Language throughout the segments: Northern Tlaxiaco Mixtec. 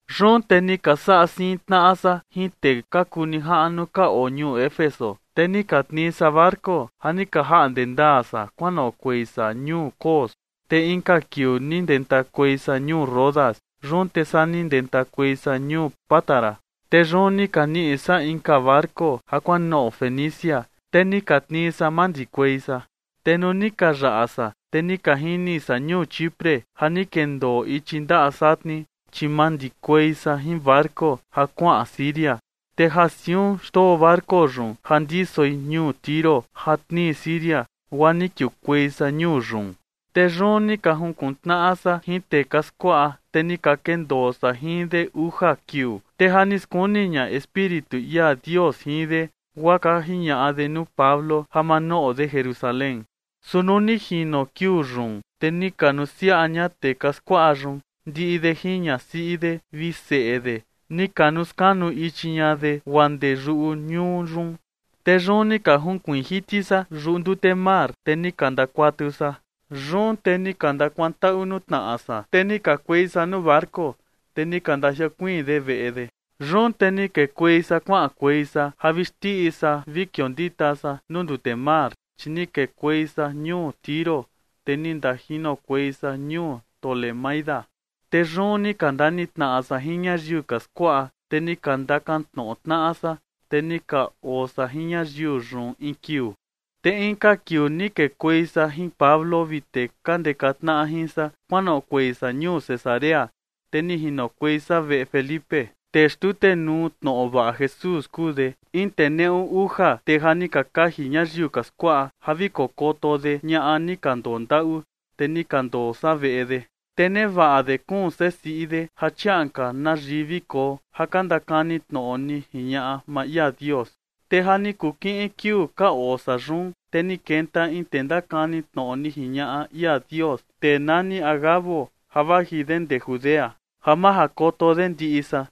Yun te ni ka saꞌa siin tnaꞌa san jin tee ka kuu nijaꞌnu ka oo ñuu Éfeso, te ni ka tnii san barco ja ni ka jaꞌnde ndaa san kuanoꞌokuei san ñuu Cos, te inka kiuu ni ndentakuei san ñuu Rodas. Yun te saa ni ndentakuei san ñuu Pátara. Te yun ni ka niꞌi san inka barco ja kuanoꞌo Fenicia, te ni ka tnii san mandikuei san. Te nuu ni ka yaꞌa san, te ni ka jini san ñuu Chipre ja ni kendoo ichi ndaꞌa satni, chi mandikuei san jin barco ja kuaꞌan Siria, te ja siun xndoo barco yun ja ndisoi ñuu Tiro ja tnii Siria, guaa ni kiukuei san ñuu yun. Te yun ni ka jinkuntnaꞌa san jin tee ka skuaꞌa, te ni ka kendoo san jin de uja kiuu, te ja ni skuni ña Espíritu ia Dios jin de, guaa ka jiñaꞌa de nuu Pablo ja ma noꞌo de Jerusalén. Su nuu ni jino kiuu yun, te ni ka nusiaꞌa ña tee ka skuaꞌa yun, ndiꞌi de jin ñasiꞌi de vi seꞌe de, ni ka nuskanuu ichi ña de guaa ndee yuꞌu ñuu yun. Te yun ni ka junkuiin jiti san yuꞌu ndute mar, te ni ka ndakuatu san. Yun te ni ka ndakuantaꞌu nuu tnaꞌa san, te ni kakuei san nuu barco, te ni ka ndajiokuiin de veꞌe de. Yun te ni kekuei san kuaꞌankuei san ja vi xndiꞌi san vi kiondita san nuu ndute mar, chi ni kekuei san ñuu Tiro, te ni ndajinokuei san ñuu Tolemaida. Te yun ni ka ndanitnaꞌa san jin ñayiu ka skuaꞌa, te ni ka ndakantnoꞌo tnaꞌa san. Te ni ka oo san jin ñayiu yun in kiuu. Te inka kiuu ni kekuei san jin Pablo vi tee ka ndeka tnaꞌa jin san kuanoꞌokuei san ñuu Cesarea, te ni jinokuei san veꞌe Felipe, tee xtutenuu tnoꞌo vaꞌa Jesús kuu de, in tee neꞌu uja tee ja ni ka kaji ñayiu ka skuaꞌa ja vi kokoto de ñaꞌa ni ka ndondaꞌu, te ni ka ndoo san veꞌe de. Te nevaꞌa de kuun sesiꞌi de ja chiaꞌan ka na yii vi koo, ja ka ndakani tnoꞌo ni jiñaꞌa maa ia Dios. Te ja ni kuu kiꞌin kiuu ka oo san yun, te ni kenta in tee ndakani tnoꞌo ni jiñaꞌa ia Dios, tee nani Agabo ja vaji de ndee Judea, ja majakoto de ndiꞌi san.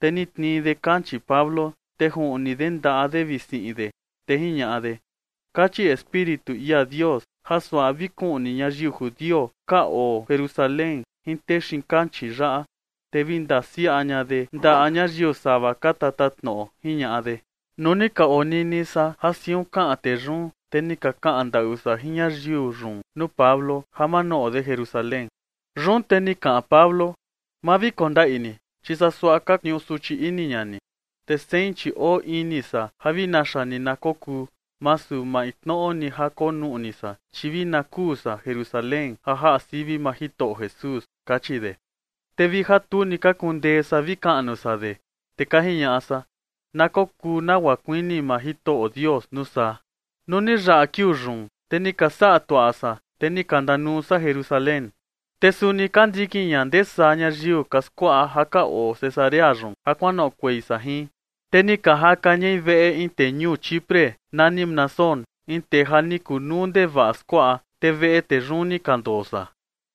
Te ni tnii de kanchii Pablo, te ni juꞌni de ndaꞌa de vi siꞌin de, te jiñaꞌa de: ―Kachi Espíritu ia Dios ja suaꞌa vi kuꞌni ñayiu judio ka oo Jerusalén jin tee xiin kanchii yaꞌa, te vi ndasiaꞌa ña de ndaꞌa ñayiu sava ka tatatnoꞌo ―jiñaꞌa de. Nuu ni ka onini san ja siun kaꞌan tee yun, te ni ka kaꞌan ndaꞌu san jin ñayiu yun nuu Pablo ja ma noꞌo de Jerusalén. Yun te ni kaꞌan Pablo: ―Ma vi kondaꞌi ni, chi saa suaꞌa ka tniuu suchi ini ña ni. Te sein chi oo ini san ja vi naxa ni na kokuu, masu maintnoꞌo ni ja konuꞌni san, chi vi na kuu san Jerusalén ja jaꞌa sivi maa Jitoꞌo Jesús ―kachi de. Te vi ja tu ni ka kundee san vi kaꞌnu san de, te ka jiñaꞌa san: ―Na kokuu nagua kuini maa Jitoꞌo Dios, nuu saa. Nuu ni yaꞌa kiuu yun, te ni ka saꞌa tuaꞌa san, te ni ka ndanuu san Jerusalén. Te suni ka ndikin ña ndee saa ñayiu ka skuaꞌa ja ka oo Cesarea yun ja kuanoꞌokuei san jin, te ni ka jaka ñai veꞌe in tee ñuu Chipre nani Mnasón, in tee ja ni kunuu ndevaꞌa skuaꞌa, te veꞌe tee yun ni ka ndoo san.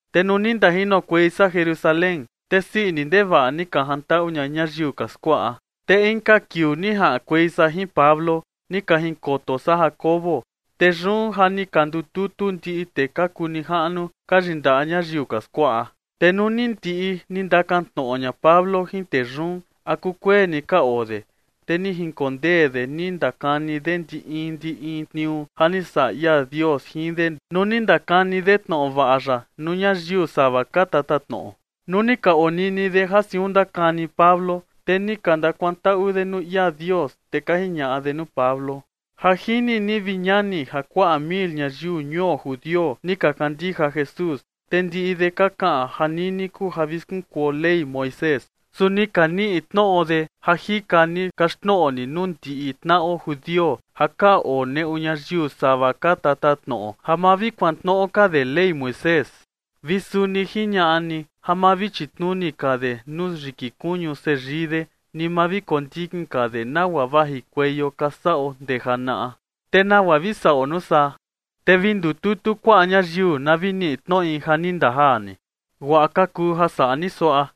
Te nuu ni ndajinokuei san Jerusalén, te sii ini ndevaꞌa ni ka jantaꞌu ña ñayiu ka skuaꞌa. Te inka kiuu ni jaꞌankuei san jin Pablo, ni ka jinkoto san Jacobo. Te yun ja ni ka ndututu ndiꞌi tee ka kuu nijaꞌnu ka yindaꞌa ñayiu ka skuaꞌa. Te nuu ni ndiꞌi ni ndakantnoꞌo ña Pablo jin tee yun a kukueni ka oo de, te ni jinkondee de ni ndakani de ndi in ndi in tniuu ja ni saꞌa ia Dios jin de nuu ni ndakani de tnoꞌo vaꞌa ya nuu ñayiu sava ka tatatnoꞌo. Nuu ni ka onini de ja siun ndakani Pablo, te ni ka ndakuantaꞌu de nuu ia Dios, te ka jiñaꞌa de nuu Pablo: ―Ja jini ni, vi ñani, ja kuaꞌa mil ñayiu ñuo judio ni ka kandija Jesús, te ndiꞌi de ka kaꞌan ja nini kuu ja vi skunkuo Ley Moisés. Su ni ka niꞌi tnoꞌo de ja jika ni kaxtnoꞌo ni nuu ndiꞌi tnaꞌo judio ja ka oo neꞌu ñayiu sava ka tatatnoꞌo ja ma vi kuantnoꞌo ka de Ley Moisés, vi suni jiñaꞌa ni ja ma vi chitnuni ka de nuu yiki kuñu seyii de, ni ma vi kondikin ka de nagua vajikueio ka saꞌo ndee janaꞌa. ¿Te nagua vi saꞌo nuu saa? Te vi ndututu kuaꞌa ñayiu na vi niꞌi tnoꞌi ja ni ndajaa ni. Guaꞌa ka kuu ja saꞌa ni suaꞌa: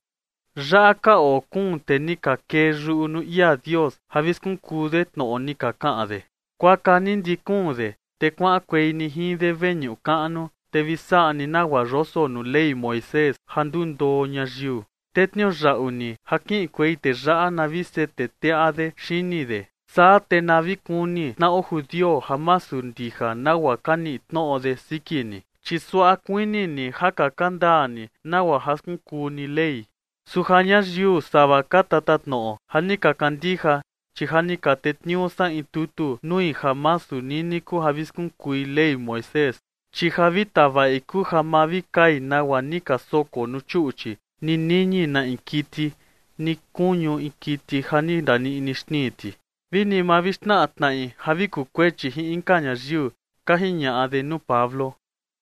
yaꞌa ka oo kuun tee ni ka kee yuꞌu nuu ia Dios ja vi skunkuu de tnoꞌo ni ka kaꞌan de. Kuaka ni ndiꞌi kuun de, te kuaꞌankuei ni jin de veñuꞌu kaꞌnu, te vi saꞌa ni nagua yoso nuu Ley Moisés ja ndundoo ñayiu, te tniuyaꞌu ni ja kiꞌinkuei tee yaꞌa, na vi sete teꞌa de xini de. Saa te na vi kuni tnaꞌo judio ja masu ndija nagua ka niꞌi tnoꞌo de siki ni, chi suaꞌa kuini ni ja kaka ndaa ni nagua ja skunkuu ni Ley. Su ja ñayiu sava ka tatatnoꞌo ja ni ka kandija, chi ja ni ka tetniuu san in tutu nui ja masu nini kuu ja vi skunkui Ley Moisés, chi ja vi tavaꞌi kuu ja ma vi kai nagua ni ka soko nuu chuꞌchi, ni niñi na in kiti, ni kuñu in kiti ja ni ndaniꞌni xnii ti, vi ni ma vi xnaꞌa tnaꞌi ja vi kukuechi jin inka ñayiu ―ka jiñaꞌa de nuu Pablo.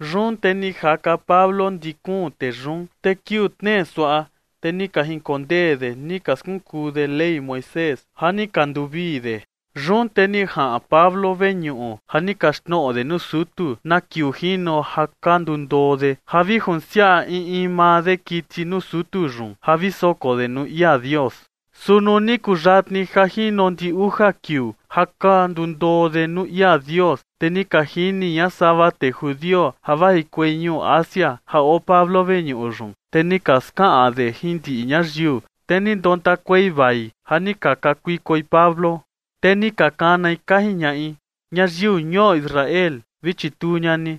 Yun te ni jaka Pablo ndi kuun tee yun, te kiuu tnee suaꞌa, te ni ka jinkondee de ni ka skunkuu de Ley Moisés ja ni ka nduvii de. Yun te ni jaꞌan Pablo veñuꞌu ja ni kaxtnoꞌo de nuu sutu na kiuu jino ja ka ndundoo de ja vi junsiaꞌa in in maa de kiti nuu sutu yun ja vi soko de nuu ia Dios. Su nuu ni kuyatni ja jino ndiꞌi uja kiuu ja ka ndundoo de nuu ia Dios, te ni ka jini ña sava tee judio ja vajikuei ñuu Asia ja oo Pablo veñuꞌu yun. Te ni ka skaꞌan de jin ndiꞌi ñayiu, te ni ndontakuei vai ja ni ka kakuikoi Pablo. Te ni ka kanai, ka jiñaꞌi: ―¡Ñayiu ñuo Israel, vi chituu ña ni!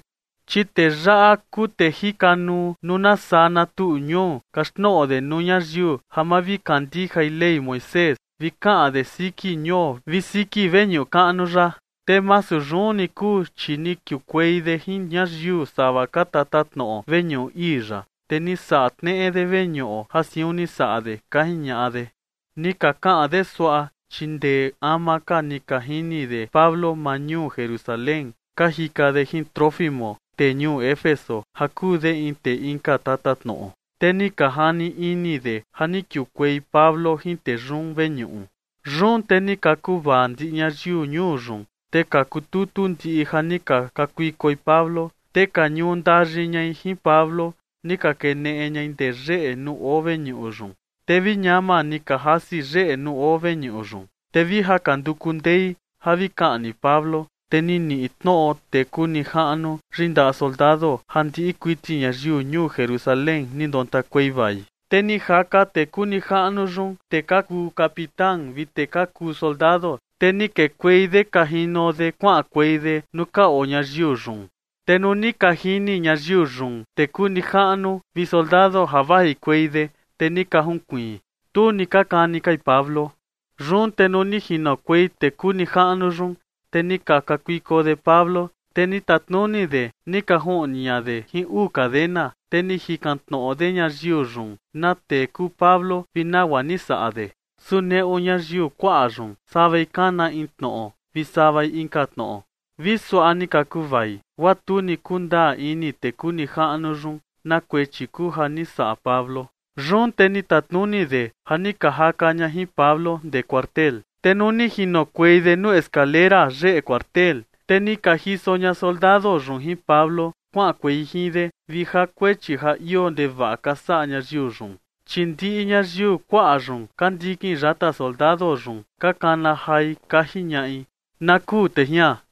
Chi tee yaꞌa kuu tee jikanuu nuu na saa na tuꞌu ñuu kaxtnoꞌo de nuu ñayiu ja ma vi kandijai Ley Moisés, vi kaꞌan de siki ñuo vi siki veñuꞌu kaꞌnu yaꞌa. Te masu yun ni kuu, chi ni kiukuei de jin ñayiu sava ka tatatnoꞌo veñuꞌu ii yaꞌa, te ni saꞌa tneꞌe de veñuꞌo, ja siun ni saꞌa de ―ka jiñaꞌa de. Ni ka kaꞌan de suaꞌa, chi ndee ama ka ni ka jini de Pablo maa ñuu Jerusalén, ka jika de jin Trófimo, tee ñuu Éfeso ja kuu de in tee inka tatatnoꞌo, te ni ka jani ini de ja ni kiukuei Pablo jin tee yun veñuꞌu. Yun te ni ka kuvaa ndiꞌi ñayiu ñuu yun, te ka kututu ndiꞌi ja ni ka kakuikoi Pablo, te ka ñuu ndayi ñai jin Pablo, ni ka keneꞌe ñai ndee yeꞌe nuu oo veñuꞌu yun. Te vi ñama ni ka jasi yeꞌe nuu oo veñuꞌu yun. Te vi ja ka nduku ndei ja vi kaꞌni Pablo, te ni niꞌi tnoꞌo tee kuu nijaꞌnu yindaꞌa soldado ja ndiꞌi kuiti ñayiu ñuu Jerusalén ni ndontakuei vai. Te ni jaka tee kuu nijaꞌnu yun tee ka kuu capitán vi tee ka kuu soldado, te ni kekuei de ka jino de kuaꞌankuei de nuu ka oo ñayiu yun. Te nuu ni ka jini ñayiu yun tee kuu nijaꞌnu vi soldado ja vajikuei de, te ni ka junkuiin. Tu ni ka kani kai Pablo. Yun te nuu ni jinokuei tee kuu nijaꞌnu yun, te ni ka kakuiko de Pablo, te ni tatnuni de ni ka juꞌni ña de jin uu cadena, te ni jikan tnoꞌo de ñayiu yun na tee kuu Pablo vi nagua ni saꞌa de. Su neꞌu ñayiu kuaꞌa yun, savai kana in tnoꞌo vi savai inka tnoꞌo, vi suaꞌa ni ka kuvai, guaa tu ni kundaa ini tee kuu nijaꞌnu yun na kuechi kuu ja ni saꞌa Pablo. Yun te ni tatnuni de ja ni ka jaka ña jin Pablo ndee cuartel. Te nuu ni jinokuei de nuu skalera yeꞌe cuartel, te ni ka jiso ña soldado yun jin Pablo kuaꞌankuei jin de, vi ja kuechi ja ioo ndevaꞌa ka saꞌa ñayiu yun. Chi ndiꞌi ñayiu kuaꞌa yun ka ndikin yata soldado yun ka kana jai, ka jiñaꞌi: ―¡Na kuu tee jian!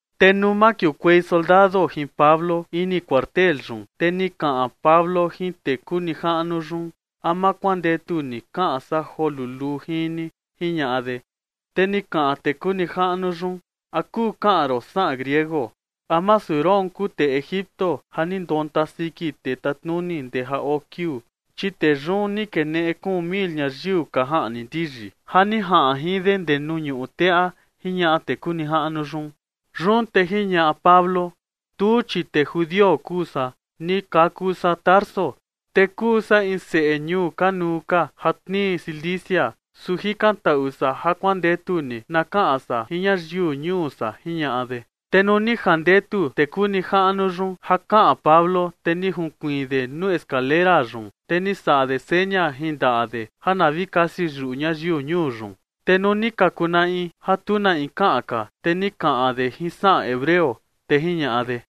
Te nuu makiukuei soldado jin Pablo ini cuartel yun, te ni kaꞌan Pablo jin tee kuu nijaꞌnu yun: ―¿A ma kuandetu ni kaꞌan san joo luluu jin ni? ―jiñaꞌa de. Te ni kaꞌan tee kuu nijaꞌnu yun: ―¿A kuu kaꞌan ron saꞌan griego? ¿A masu roon kuu tee Egipto ja ni ndonta siki tee tatnuni ndee ja oo kiuu? Chi tee yun ni keneꞌe kuun mil ñayiu ka jaꞌni ndiyi ja ni jaꞌan jin de ndee nuu ñuꞌu teꞌa ―jiñaꞌa tee kuu nijaꞌnu yun. Yun te jiñaꞌa Pablo: ―Tuu, chi tee judio kuu san. Ni kaku san Tarso, te kuu san in seꞌe ñuu kanuu ka ja tnii Cilicia, su jikantaꞌu san ja kuandetu ni na kaꞌan san jin ñayiu ñuu san ―jiñaꞌa de. Te nuu ni jandetu tee kuu nijaꞌnu yun ja kaꞌan Pablo, te ni junkuiin de nuu skalera yun, te ni saꞌa de seña jin ndaꞌa de ja na vi kasi yuꞌu ñayiu ñuu yun. Te nuu ni ka kunaꞌi ja tu na in kaꞌan ka, te ni kaꞌan de jin saꞌan hebreo, te jiñaꞌa de: